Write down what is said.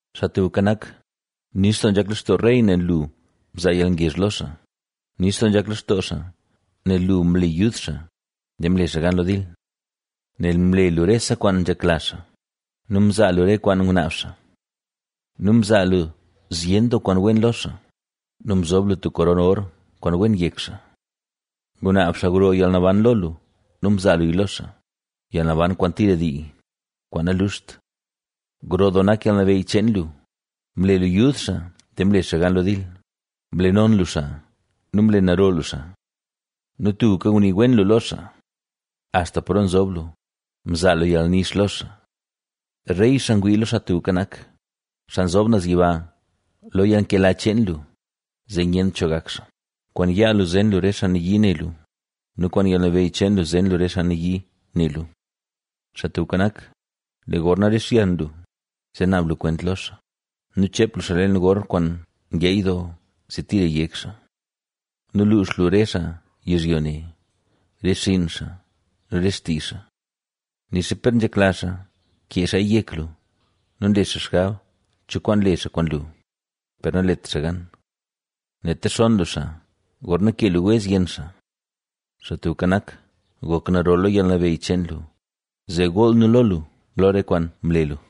Xaa Tubka Nak, nix doo nzhak lextoo rey nel lu mzaa yalngezh lo xaa, nix doo nzhak lextoo xaa nel lu mle yud xaa, zee mle xaa gan lo dil. Nel mle lu rese kwaan nzhekla xaa nu mzaa lu re kwaan ngunaab xaa. Nu mzaa lu zyen doo kwaan wen lo xaa nu mzob lu tub koron or kwaan wen yek xaa. Ngunaab xaa gro yalnaban lo lu nu mzaa luya lo xaa, yalnaban kwaan tira dii, kwaan naluxt. Gro doo nak yalnabeyy cheen lu, mle lu yud xaa zee mle xaa gan lo dil, mle non lu xaa nu mle naro lu xaa. Nu tubka ngunii wen lu lo xaa, axta paro nzob lu, mzaa lu yalnix lo xaa. Rey, xaa ngwii lo Xaa Tubka Nak, Xaa Nzob Naz Yiba lo yalnkela cheen lu, zee nyent cho gak xaa. Kwaan yaa lu zen lu re xaa nayii ne lu nu kwaan yalnabeyy cheen lu zen lu re xaa nayii ne lu. Xaa Tubka Nak, lee gorna rixyan lu, zee naab lu kwent lo xaa nu cheep lu xaa leen gor kwaan ngeey doo, zee tira yek xaa. Nu luux lu re xaa yizhyo ne, re xinn xaa nu re xtii xaa. Nixa per nzhekla xaa kee xaaya yek lu nu nle xaa xgab cho kwaan le xaa kwaan lu, per nalet xaa gan. Nel texonn lu xaa, gorna kee lu wez yenn xaa. Xaa Tubka Nak, gok naro lo yalnabeyy cheen lu, zee gool nu lo lu, lo re kwaan mle lu.